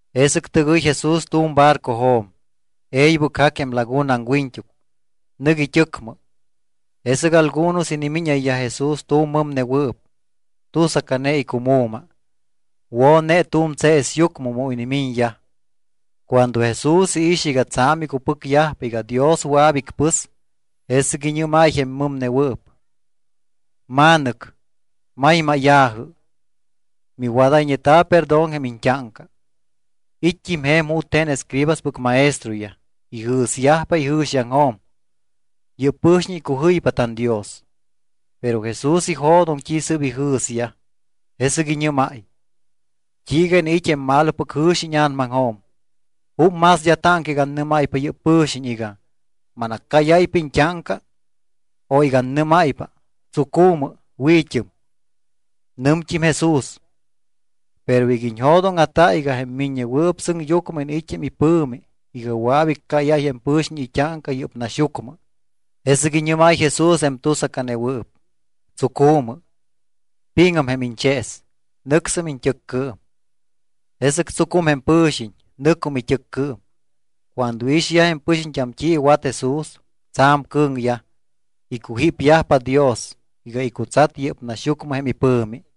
Jesɨc tɨgɨy Jesús tu̱m barcojo̱m, e̱ybɨc jac jém laguna aŋwiñt́uc. Nɨc it́ɨcmɨ. Jesɨc algunos inimíñayyaj Jesús tu̱m mɨmnewɨɨp, tusacane icumu̱ma. Wo̱ne tu̱m tseesyucmɨ mu inimiñyaj. Cuando Jesús iix iga tsa̱m icupɨcyajpa iga Dios wɨa̱p icpɨs, jesɨc iñɨ́máy jém mɨmnewɨɨp: —Ma̱nɨc, maymáya̱jɨ, miwadayñeta̱ perdón jém iñt́áŋca. It́t́im je̱m jute̱n escribaspɨc maestroyaj. Ijɨ̱syajpa ijɨ̱xiaŋjo̱m: “Yɨ́p pɨ̱xiñ icujɨypa tanDios.” Pero Jesús ijo̱doŋ t́i sɨ́p ijɨ̱syaj, jesɨc iñɨ́máy: —¿T́iiga iniit́ jém malopɨc jɨ̱xi íña̱namaŋjo̱m? ¿Júp más d́a táŋca iga annɨ́máypa yɨ́p pɨ̱xiñ iga: “Manaccáyáypa iñt́áŋca”, o iga annɨ́máypa: “Tsucu̱mɨ, wi̱t́ɨm”? Nɨmt́im Jesús: —Pero iga iñjo̱dóŋa̱ta iga jém Miññewɨɨp Sɨŋyucmɨ iniit́ jém ipɨ̱mi iga wɨa̱p iccáyáy jém pɨ̱xiñ it́áŋca yɨ́p naxyucmɨ (jesɨc iñɨ́máy Jesús jém tusacanewɨɨp): Tsucu̱mɨ, pi̱ŋɨm jém iñchees, nɨcsɨm iñt́ɨccɨɨm. Jesɨc tsucum jém pɨ̱xiñ, nɨcum it́ɨccɨɨm. Cuando iixyaj jém pɨxiñt́am t́i iwat Jesús, tsa̱m cɨ̱ŋyaj, icujípyajpa Dios iga icutsat yɨ́p naxyucmɨ jém ipɨ̱mi.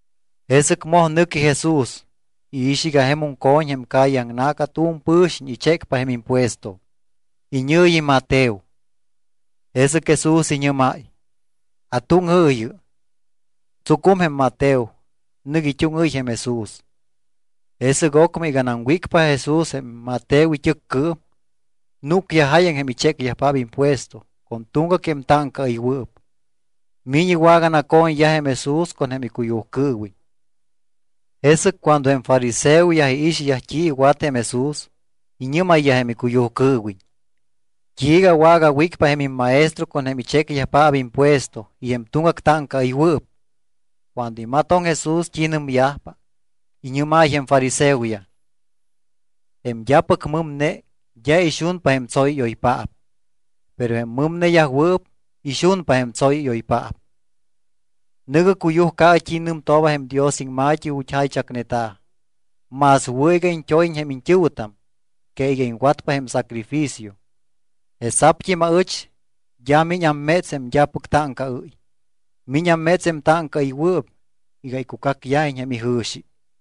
Jesɨc moj nɨqui Jesús. Iix iga jemum co̱ñ jém calle aŋna̱ca tu̱m pɨ̱xiñ ichécpa jém impuesto. Iñɨ̱yi Mateo. Jesɨc Jesús iñɨ́máy: —Atúŋɨɨyɨ. Tsucum jém Mateo, nɨc it́úŋɨ́y jém Jesús. Jesɨc ocmɨ iganam wícpa Jesús jém Mateo it́ɨccɨɨm, núcyaj jáyaŋ jém ichécyajpaap impuesto con tuŋgac jém táŋcaɨywɨɨp. Miñ iwaganaco̱ñyaj jém Jesús con jém icuyujcɨɨwiñ. Jesɨc cuando jém fariseoyaj iixyaj t́i iwat jém Jesús, iñɨ́mayyaj jém icuyujcɨɨwiñ: —¿T́iiga wagawícpa jém immaestro con jém ichécyajpaap impuesto y jém tuŋgac táŋcaɨywɨɨp? Cuando imatoŋ Jesús t́i nɨmyajpa, iñɨ́máy jém fariseoyaj: —Jém d́apɨc mɨmne d́a ixunpa jém tsóyɨ́yoypaap, pero jém mɨmneyajwɨɨp ixunpa jém tsóyɨ́yoypaap. Nɨ̱gɨ cuyujcaɨ t́i nɨmtooba jém Dios iŋma̱t́i ju̱t́ jaychacneta̱: “Más wɨ̱ iga iñt́óyiñ jém iñt́ɨ̱wɨtam que iga iŋwatpa jém sacrificio.” Jesa̱pt́im aɨch d́a miñ amméts jém d́apɨc táŋcaɨ́y. Miñ amméts jém táŋcaɨywɨɨp iga icucacyajiñ jém ijɨ̱xi.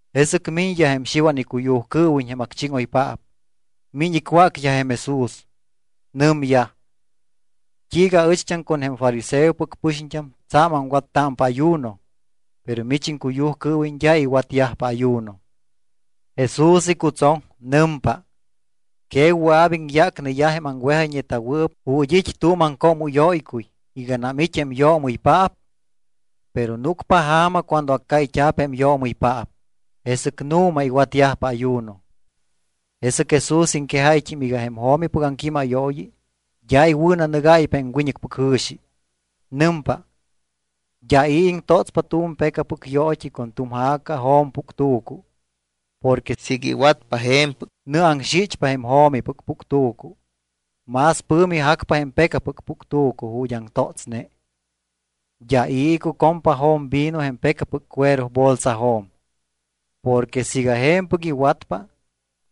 Jesɨc miñyaj jém Xiwan icuyujcɨɨwiñ jém acchíŋoypaap. Miñ icwácyaj jém Jesús. Nɨmyaj: —¿T́iiga aɨcht́am con jém fariseopɨc pɨxiñt́am tsa̱m aŋwattámpa ayuno, pero mich iŋcuyujcɨɨwiñ d́a iwatyajpa ayuno? Jesús icutsoŋ. Nɨmpa: —¿Que wɨa̱p iŋyácneyaj jém aŋwejayñeta̱wɨɨp ju̱t́ it́ tu̱m aŋcoomɨ́yóycuy iganam it́ jém yoomɨypaap? Pero núcpa ja̱ma cuando accáyt́a̱p jém yoomɨypaap, jesɨc nu̱ma iwatyajpa ayuno. Jesɨc Jesús iŋquejáyt́im iga jém jo̱mipɨc aŋquímayooyi d́a iwɨ̱nanɨgáypa jém wiñɨcpɨc jɨ̱xi. Nɨmpa: —D́a i̱ iŋtótspa tu̱m pecapɨc yoot́i con tu̱m ja̱ca jo̱mpuctu̱cu. Porque siiga iwatpa je̱mpɨc, nɨaŋxichpa jém jo̱mipɨc puctu̱cu, más pɨ̱mi jacpa jém pecapɨc puctu̱cu ju̱t́ aŋtótsne. D́a i̱ icucompa jo̱mvino jém pecapɨc cuero bolsajo̱m. Porque siiga je̱mpɨc iwatpa,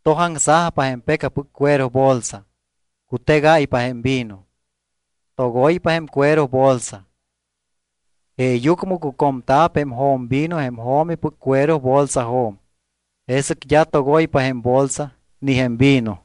tojaŋsajpa jém pecapɨc cuero bolsa, cutegáypa jém vino, togoypa jém cuero bolsa. Jeeyucmɨ cucomta̱p jém jo̱mvino jém jo̱mipɨc cuero bolsajo̱m, jesɨc d́a togoypa jém bolsa ni jém vino.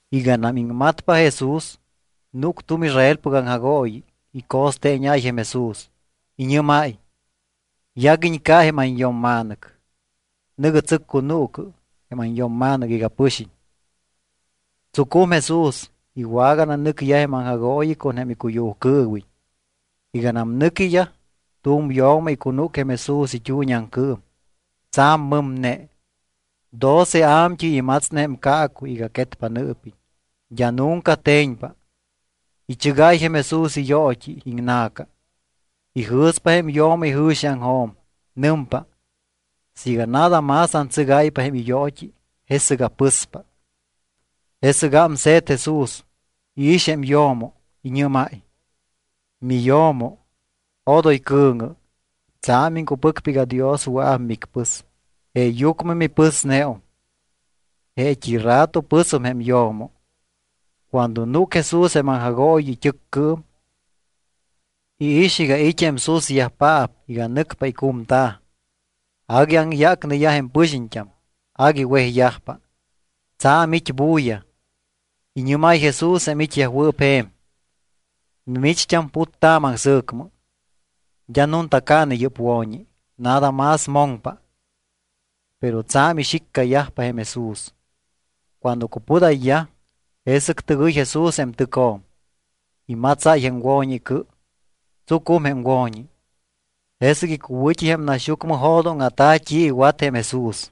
Iganam iŋmatpa Jesús, núc tu̱m Israelpɨc aŋjagooyi. Ico̱steeñáy jém Jesús. Iñɨ́máy: —Yaguiñ ca jém anyo̱mma̱nɨc. Nɨ̱gɨ tsɨccunuucɨ jém anyo̱mma̱nɨc iga pɨxiñ. Tsucum Jesús. Iwagananɨcyaj jém aŋjagooyi con jém icuyujcɨɨwiñ. Iganam nɨquiyaj, tu̱m yo̱mo icunúc jém Jesús it́uuñiaŋcɨɨm. Tsa̱m mɨmne. Doce a̱mt́ɨy imatsne jém caacuy iga quetpa iñɨɨpiñ, d́a nunca te̱ñpa. Ichɨgáy jém Jesús iyoot́i iŋna̱ca. Ijɨ̱spa jém yo̱mo ijɨ̱xiaŋjo̱m. Nɨmpa: “Siiga nada más antsɨgáypa jém iyoot́i, jesɨc apɨspa.” Jesɨc ámse̱t Jesús, iix jém yo̱mo. Iñɨ́máy: —Miyo̱mo, odoy cɨ̱ŋɨ. Tsa̱m iŋcupɨcpa iga Dios wɨa̱p micpɨs, jeeyucmɨ mipɨsneum. Jeet́i rato pɨsum jém yo̱mo. Cuando núc Jesús jém aŋjagooyi it́ɨccɨɨm, iix iga it́ jém susyajpaap iga nɨcpa icumta̱. Agui aŋyácneyaj jém pɨxiñt́am. Agui wejyajpa. Tsa̱m it́ bulla. Iñɨ́máy Jesús jém it́yajwɨɨp je̱m: —Mimicht́am puttaamɨ aŋsɨ̱cmɨ. D́a nunta caane yɨ́p wo̱ñi. Nada más moŋpa. Pero tsa̱m ixiccayajpa jém Jesús. Cuando cupudayyaj, jesɨc tɨgɨy Jesús jém tɨcjo̱m. Imatsáy jém wo̱ñi icɨ, tsucum jém wo̱ñi. Jesɨc icuwɨ̱t́i jém naxyucmɨ jo̱dóŋa̱ta̱ t́i iwat jém Jesús.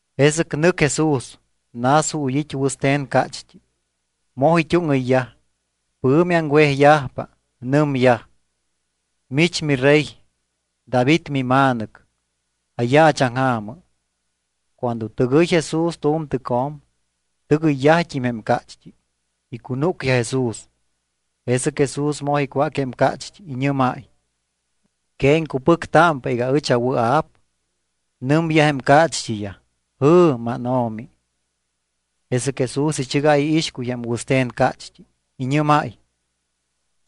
Jesɨc nɨc Jesús. Nas ju̱t́ it́ wɨste̱n cácht́i. Moj it́úŋɨyyaj. Pɨ̱mi aŋwejyajpa. Nɨmyaj: —Mich mirey David mima̱nɨc, ayaachaŋja̱mɨ. Cuando tɨgɨyñe Jesús tu̱m tɨcjo̱m, tɨgɨyyajt́im jém cácht́i. Icunúcyaj Jesús. Jesɨc Jesús moj icwác jém cácht́i. Iñɨ́máy: —¿Que iŋcupɨctámpa iga ɨch awɨa̱p? Nɨmyaj jém cácht́iyaj: —¡Jɨ̱, mánO̱mi! Jesɨc Jesús ichɨgáy iixcuy jém wɨste̱n cácht́i. Iñɨ́máy: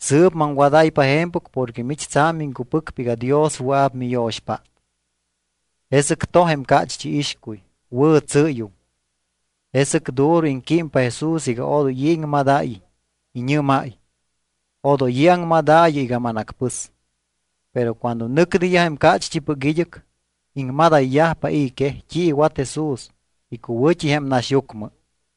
—Sɨɨp maŋwadáypa je̱mpɨc porque mich tsa̱m iŋcupɨcpa iga Dios wɨa̱p miyo̱xpát. Jesɨc toj jém cácht́i iixcuy. Wɨ̱tsɨ́yum. Jesɨc duro iŋquímpa Jesús iga odoy i̱ iŋmadáyiñ. Iñɨ́máy: —Odoy i̱ aŋmadaayɨ iga manacpɨs. Pero cuando nɨcneyaj jém cácht́ipɨc id́ɨc, iŋmadayyajpa i̱ quej t́i iwat Jesús icuwɨ̱t́i jém naxyucmɨ.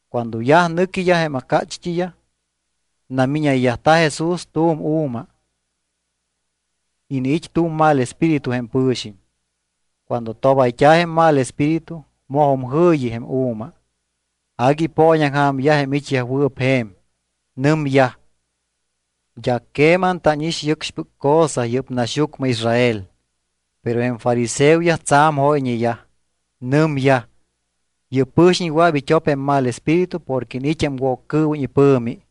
Cuando yaj nɨquiyaj jém cácht́iyaj, namíñayt́a̱ Jesús tu̱m u̱ma. Iniit́ tu̱m mal espíritu jém pɨ̱xiñ. Cuando tobayt́a̱ jém mal espíritu mojum jɨ̱yi jém u̱ma. Agui ipooñaŋja̱myaj jém it́yajwɨɨp je̱m. Nɨmyaj: —D́a queman tánix yɨcxpɨc cosa yɨ́p naxyucmɨ Israel. Pero jém fariseoyaj tsa̱m jóyñeyaj. Nɨmyaj: —Yɨ́p pɨ̱xiñ wɨa̱p it́op jém mal espíritu porque iniit́ jém Woccɨɨwiñ ipɨ̱mi.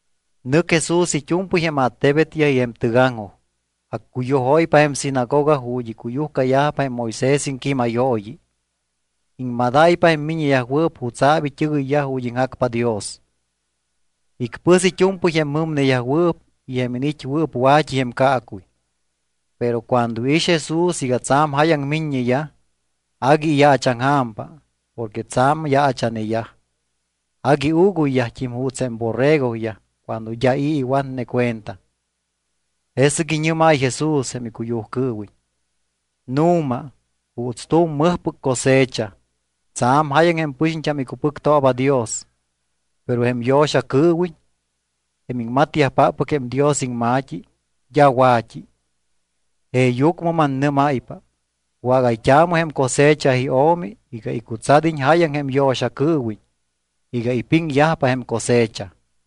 Nɨc Jesús it́u̱mpɨy jém attebetyaj y jém tɨgaŋjoj. Accuyujóypa jém sinagoga ju̱t́ icuyujcayajpa jém Moisés iŋquímayooyi. Iŋmadáypa jém miññeyajwɨɨp jutsa̱p it́ɨgɨyyaj ju̱t́ iŋjacpa Dios. Icpɨs it́u̱mpɨy jém mɨmneyajwɨɨp y jém iniit́wɨɨp wa̱t́i jém caacuy. Pero cuando iix Jesús iga tsa̱m jáyaŋ miññeyaj, agui iyaachaŋja̱mpa porque tsa̱m yaacha̱neyaj, agui uuguyyajt́im juuts jém borregoyaj cuando d́a i̱ iwatne cuenta. Jesɨc iñɨ́máy Jesús jém icuyujcɨɨwiñ: —Nu̱ma, juuts tu̱m mɨjpɨc cosecha, tsa̱m jáyaŋ jém pɨxiñt́am icupɨctooba Dios, pero jém yo̱xacɨɨwiñ, jém iŋmatyajpáppɨc jém Dios iŋma̱t́i, d́a wa̱t́i. Jeeyucmɨ mannɨ́máypa, wágayt́aamɨ jém cosecha iO̱mi iga icutsad́iñ jáyaŋ jém yo̱xacɨɨwiñ iga ipiŋyajpa jém cosecha.